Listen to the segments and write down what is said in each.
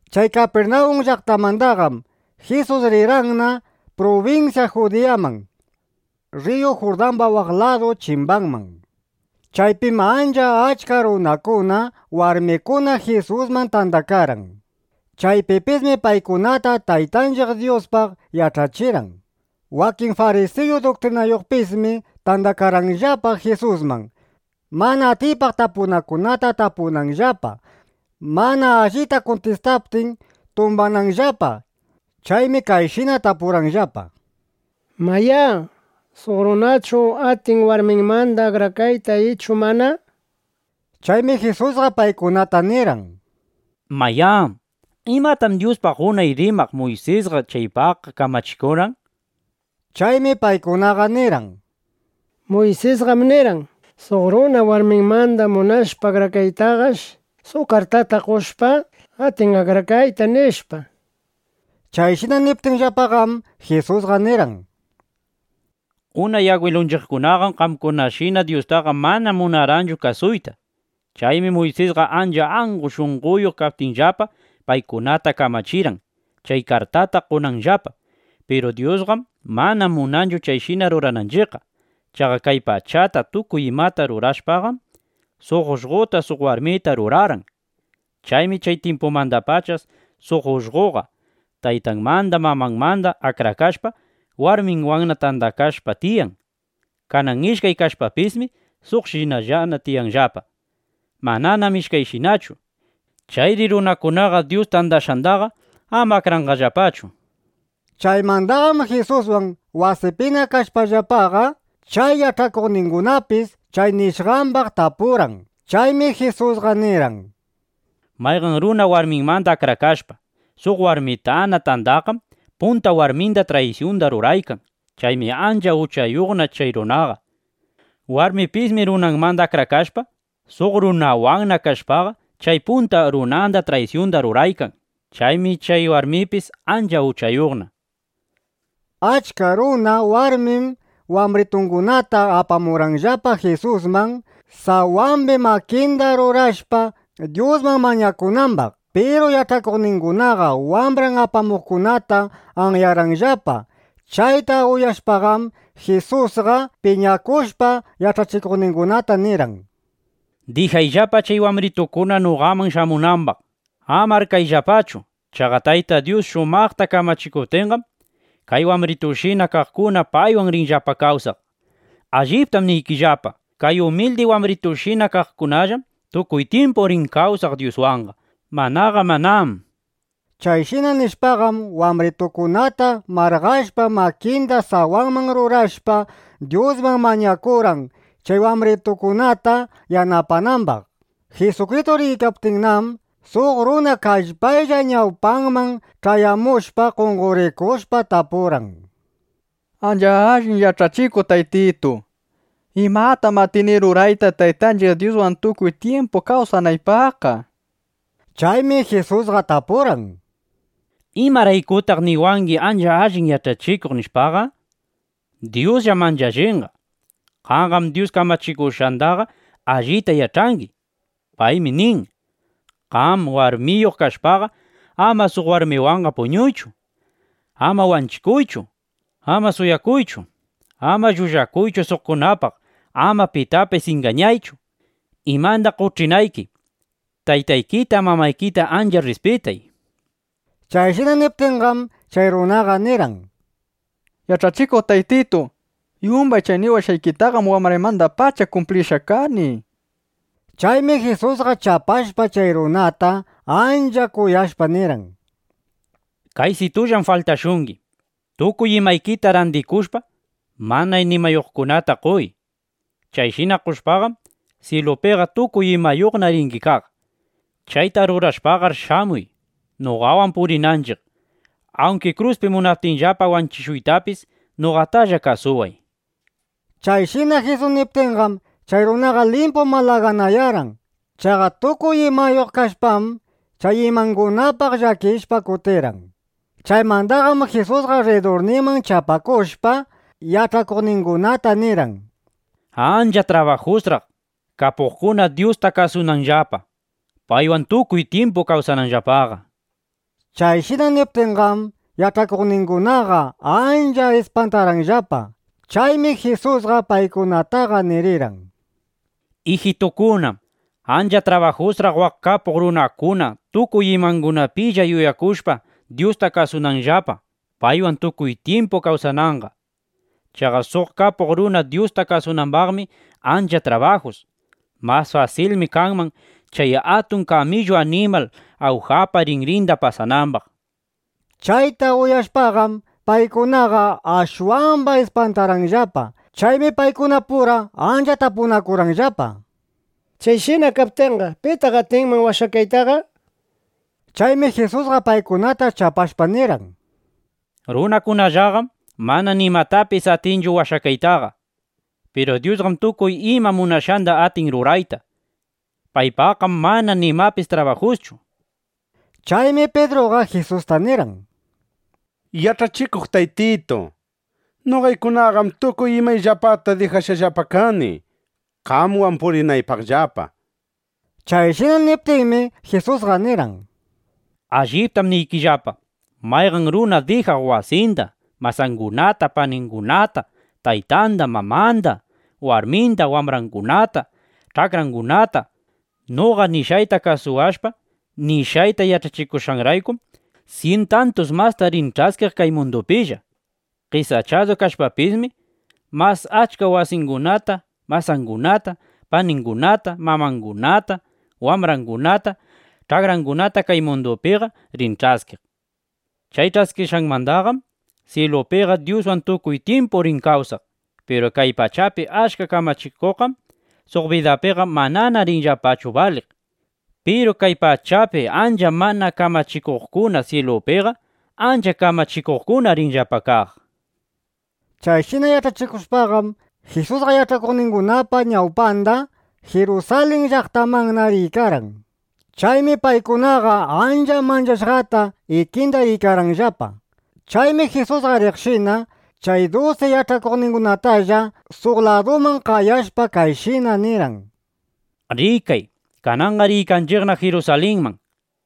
Chay Kapirnawun llaqtamandaqam Jisus rirqanna prubinsya Judiyaman, rriyu Jurdamba waq ladu chimbanman. Chaypim ancha achka runakuna, warmikuna Jisusman tandakarqan. Chaypipismi paykunata Taytanchiq Dyuspaq yach'achirqan. Wakin farisiyu duktrinayuqpismi tandakarqanllapa Jisusman, mana atiypaq tapunakunata tapunanllapa, mana allita kuntistaptin, tumbananllapa. Chaymi kayshina tapurqanllapa: —Mayá, ¿suq runachu atin warminmanda akrakayta ichu mana? nishpa. Chaymi Jisusqa paykunata nirqan: —Mayá, ¿imatam Dyuspaq unay rimaq Muysisqa chaypaqqa kamachikurqan? nishpa. Chaymi paykunaqa nirqan: —Muysismi nirqan, suq runa warminmanda munashpa akrakaytaqash, suq kartata qoshpa, atin akrakayta, nishpa. Chayshina niptinllapaqam, Jisusqa nirqan: —Unay agwilunchiqkunaqam qamkunashina Dyustaqa mana munarqanchu kasuyta. Chaymi Muysisqa ancha angu shunqoyuq kaptinllapa, paykunata kamachirqan, chay kartata qonanllapa. Piru Dyusqam mana munanchu chayshina rurananchiqqa. Chaqa kay pachata tukuy imata rurashpaqam, suq ullqota, suq warmita rurarqan. Chaymi chay tyimpumandapacha suq ullqoqa taytanmanda, mamanmanda akrakashpa, warminwanna tandakashpa tiyan. Kanan ishkay kashpapismi suqshinallana tiyanllapa. Mananam ishkayshinachu. Chayri runakunaqa Dyus tandashqandaqa ama akranqallapachu, nishpa. Chaymandaqam Jisuswan wasipina kashpallapaqa, chay yach'akuqningunapis chay nishqambaq tapurqan. Chaymi Jisusqa nirqan: —Mayqan runa warminmanda akrakashpa, suq warmitana tandaqqam, punta warminda traysyunda ruraykan. Chaymi ancha uchayuqna chay runaqa. Warmipismi runanmanda akrakashpa, suq runawan kashpaqa, chay punta runanda traysyunda ruraykan. Chaymi chay warmipis ancha uchayuqna. Achka runa, warmim wambritungunata apamurqanllapa Jisusman, sawambi makinda rurashpa, Dyusman mañakunambaq. Piru yach'akuqningunaqa wambran apamuqkunata anyarqanllapa. Chayta uyashpaqam Jisusqa piñakushpa, yach'akuqningunata nirqan: —Dijayllapa chay wambritukuna noqaman shamunambaq. Ama arkayllapachu. Chaqa Tayta Dyus shumaqta kamachikuptinqam, kay wambritushina kaqkuna paywan rinllapa kawsaq. Alliptam niykillapa, kay umildi wambritushina kaqkunallam tukuy tyimpu rin kawsaq Dyuswanqa; manaqa manám. Chayshina nishpaqam, wambritukunata marqashpa, makinda sawanman rurashpa, Dyusman mañakurqan, chay wambritukunata yanapanambaq. Jisukristu riykaptinnam, suq runa kallpaylla ñawpanman ch'ayamushpa, qonqorikushpa, tapurqan: —Ancha allin Yach'achikuq Taytitu, ¿imatam atini rurayta, Taytanchiq Dyuswan tukuy tyimpu kawsanaypaqqa? nishpa. Chaymi Jisusqa tapurqan: —¿Imaraykutaq niwangi: “Ancha allin Yach'achikuq”, nishpaqa? Dyusllam ancha allinqa. Qamqam Dyus kamachikushqandaqa allita yach'angi. Paymi nin: “Qam warmiyuq kashpaqa, ama suq warmiwanqa puñuychu; ama wanchikuychu; ama suwakuychu; ama llullakuychu suqkunapaq; ama pitapis ingañaychu, imanda qoch'inayki; taytaykita, mamaykita ancha rrispitay”, nishpa. Chayshina niptinqam, chay runaqa nirqan: —Yach'achikuq Taytitu, yumbay chay niwashqaykitaqam wambraymandapacha kumplishqa kani, nishpa. Chaymi Jisusqa chapashpa, chay runata ancha kuyashpa, nirqan: —Kaysitullam faltashungi. Tukuy imaykita randikushpa, mana nimayuqkunata qoy. Chayshina qoshpaqam, syilupiqa tukuy imayuqna ringi kaq. Chayta rurashpaqar shamuy, noqawan purinanchiq. ˻Awnki kruspi munaptinllapa wanchishuytapis, noqatalla kasuway,˼ nishpa. Chayshina Jisus niptinqam, chay runaqa limpu malaganayarqan. Chaqa tukuy imayuq kashpam, chay imangunapaq llakishpa, kutirqan. Chaymandaqam Jisusqa rridurninman chapakushpa, yach'akuqningunata nirqan: —¡Ancha trabajusraq, kapuqkuna Dyusta kasunanllapa, paywan tukuy tyimpu kawsananllapaqa! nishpa. Chayshina niptinqam, yach'akuqningunaqa ancha ispantarqanllapa. Chaymi Jisusqa paykunataqa nirirqan: —Ijitukuna, ¡ancha trabajusraq waq kapuq runakuna, tukuy imangunapilla yuyakushpa, Dyusta kasunanllapa, paywan tukuy tyimpu kawsananqa! Chaqa suq kapuq runa Dyusta kasunambaqmi ancha trabajus. Mas fasilmi kanman chay atun kamillu animal awjapa rinrinda pasanambaq, nishpa. Chayta uyashpaqam, paykunaqa ashwamba ispantarqanllapa. Chaymi paykunapura ancha tapunakurqanllapa: —Chayshina kaptinqa, ¿pitaq atinman washakaytaqa? nishpa. Chaymi Jisusqa paykunata chapashpa nirqan: —Runakunallaqam mana nimatapis atinchu washakaytaqa. Piru Dyusqam tukuy ima munashqanda atin rurayta. Paypaqqam mana nimapis trabajuschu, nishpa. Chaymi Pidruqa Jisusta nirqan: —Yach'achikuq Taytitu, noqaykunaqam tukuy imayllapata dijashqallapa kani, qamwan purinaypaqllapa, nishpa. Chayshina niptinmi, Jisusqa nirqan: —Alliptam niykillapa, mayqan runa dijaq wasinda, masangunata, paningunata, taytanda, mamanda, warminda, wambrangunata, ch'akrangunata, noqa nishqayta kasuwashpa, nishqayta yach'achikushqanraykum, syin tantus masta rin ch'askiq kay mundupilla. Qesachadu kashpapismi, mas achka wasingunata, masangunata, paningunata, mamangunata, wambrangunata, ch'akrangunata kay mundupiqa rin ch'askiq. Chay ch'askishqanmandam syilupiqa Dyuswan tukuy tyimpu rin kawsaq. Piru kay pachapi achka kamachikuqqam suq bidapiqa manana rinllapachu baliq. Piru kay pachapi achka mana kamachikuqkunam syilupiqa ancha kamachikuqkuna rinllapa kaq. Chayshina yach'achikushpaqam, Jisusqa yach'akuqningunapa ñawpanda Jirusalin llaqtamanna riykarqan. Chaymi paykunaqa ancha manchashqata ikinda riykarqanllapa. Chaymi Jisusqa riqshina, chay dusi yach'akuqningunatalla suq laduman qayashpa, kayshina nirqan: —Rikay, kananqa riykanchiqna Jirusalinman.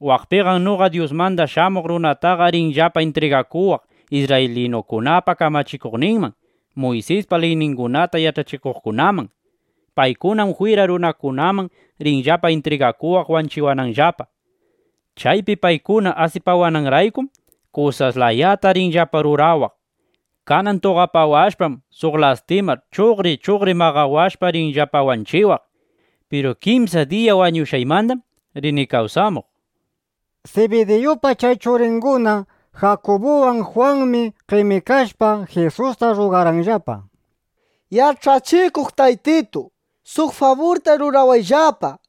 Waqpiqam noqa Dyusmanda Shamuq Runataqa rinllapa intrigakuwaq isrraylinu kurakunapa kamachikuqninman, Muysispa liyningunata yach'achikuqkunaman. Paykunam jwira runakunaman rinllapa intrigakuwaq wanchiwananllapa. Chaypi paykuna asipawananraykum, kusas layata rinllapa rurawaq. Kanan tuqapawashpam, suq lastima chuqri chuqri maqawashpa, rinllapa wanchiwaq. Piru kimsa diya wañushqaymandam rini kawsamuq, nishpa. Sibidiyupa chay churinguna Jakubuwan Jwanmi qemikashpa, Jisusta rrugarqanllapa: —Yach'achikuq Taytitu, suq faburta rurawayllapa, nishpa.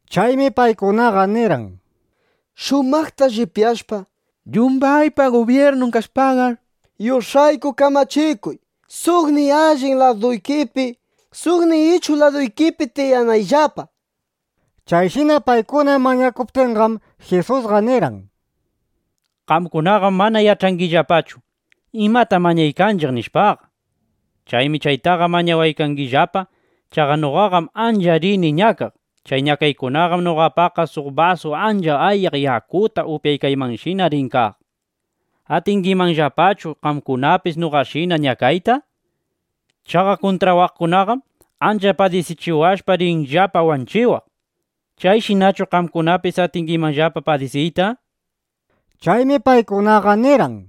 Chaymi paykunaqa nirqan: —Shumaqta llipyashpa, yumbaypa gubyirnun kashpaqar, yush'ayku kamachikuy, suqniy allin laduykipi, suqniy ichuq laduykipi tiyanayllapa, nishpa. Chayshina paykuna mañakuptinqam, Jisusqa nirqan: —Qamkunaqam mana yach'angillapachu: Imatam mañaykanchiq, nishpaqa. Chaymi chaytaqa mañawangillapa. Chaqa noqaqam ancha rini ñakaq. Chay ñakaykunaqam noqapaqqa suq basu ancha ayaq yakuta upyaykaymanshina rin kaq. ¿Atingimanllapachu qamkunapis noqashina ñakayta? Chaqa kuntrawaqkunaqam ancha padisichiwashpa, rinllapa wanchiwaq. ¿Chayshinachu qamkunapis atingimanllapa padisiyta? nishpa. Chaymi paykunaqa nirqan: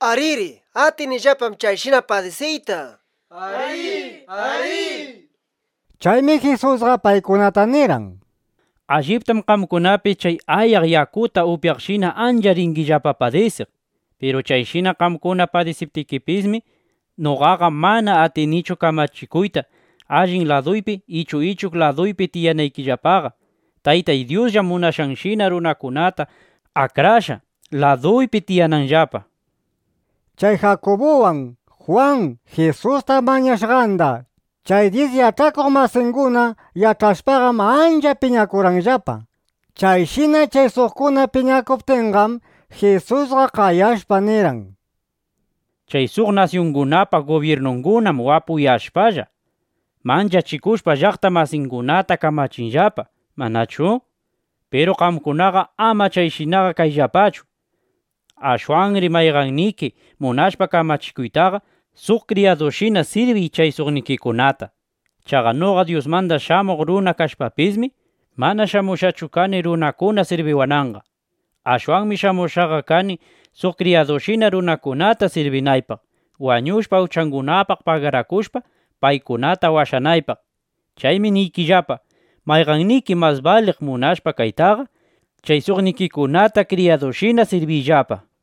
—Ariri. Atinillapam chayshina padisiyta, nishpa. Chaymi Jisusqa paykunata nirqan: —Alliptam qamkunapis chay ayaq yakuta upyaqshina ancha ringillapa padisiq. Piru chayshina qamkuna padisiptikipismi, noqaqa mana atinichu kamachikuyta, allin laduypi ichu ichuq laduypi tiyanaykillapaqa. Taytay Dyusllam munashqanshina runakunata akrashqa, laduypi tiyananllapa, nishpa. Chay Jakubuwan Jwan Jisusta mañashqanda chay dyis yach'akuq masinguna yach'ashpaqam, ancha piñakurqanllapa. Chayshina chay suqkuna piñakuptinqam, Jisusqa qayashpa, nirqan: —Chay suq nasyungunapa gubyirnungunam wapuyashpalla, manchachikushpa llaqta masingunata kamachinllapa, ¿manachu? Piru qamkunaqa ama chayshinaqa kayllapachu. Ashwanri mayqanniki munashpa kamachikuytaqa, suq kriyadushina sirbiy chay suqnikikunata. Chaqa noqa Dyusmanda Shamuq Runa kashpapismi, mana shamushqachu kani runakuna sirbiwananqa. Ashwanmi shamushqaqa kani, suq kriyadushina runakunata sirbinaypaq, wañushpa, uchangunapaq pagarakushpa, paykunata washanaypaq. Chaymi niykillapa, mayqanniki mas baliq munashpa kaytaqa, chay suqnikikunata kriyadushina sirbiyllapa, nishpa.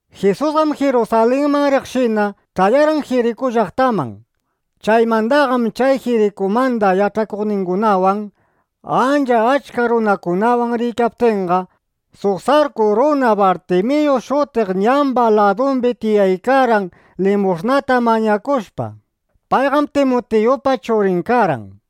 Jisusqam Jirusalinman riqshina, ch'ayarqan Jiriku llaqtaman. Chaymandaqam chay Jirikumanda yach'akuqningunawan ancha achka runakunawan riykaptinqa, suq sarku runa Bartimiyu shutiq ñamba ladumbi tiyaykarqan, limush'nata mañakushpa. Payqam Timiyupa churin karqan.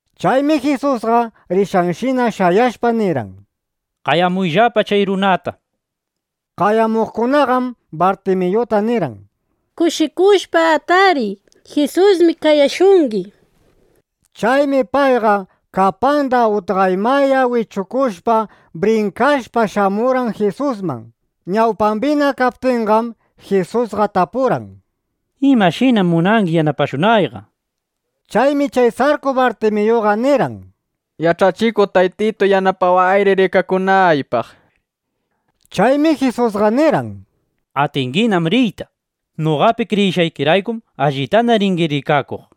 Chaymi Jisusqa rishqanshina shayashpa nirqan: —Qayamuyllapa chay runata, nishpa. Qayamuqkunaqam Bartimiyuta nirqan: —Kushikushpa atariy. Jisusmi qayashungi, nishpa. Chaymi payqa, kapanda utqaymaya wichukushpa, brinkashpa shamurqan Jisusman. Ñawpambina kaptinqam, Jisusqa tapurqan: —¿Imashinam munangi yanapashunayqa? nishpa. Chaymi chay sarku Bartimiyuqa nirqan: —Yach'achikuq Taytitu, yanapawayri rikakunaypaq, nishpa. Chaymi Jisusqa nirqan: —Atinginam riyta. Noqapi kriyishqaykiraykum allitana ringi rikakuq.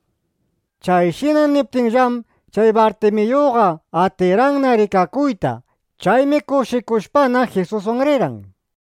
Chayshina niptinllam, chay Bartimiyuqa atirqanna rikakuyta. Chaymi kushikushpana, Jisuswan rirqan.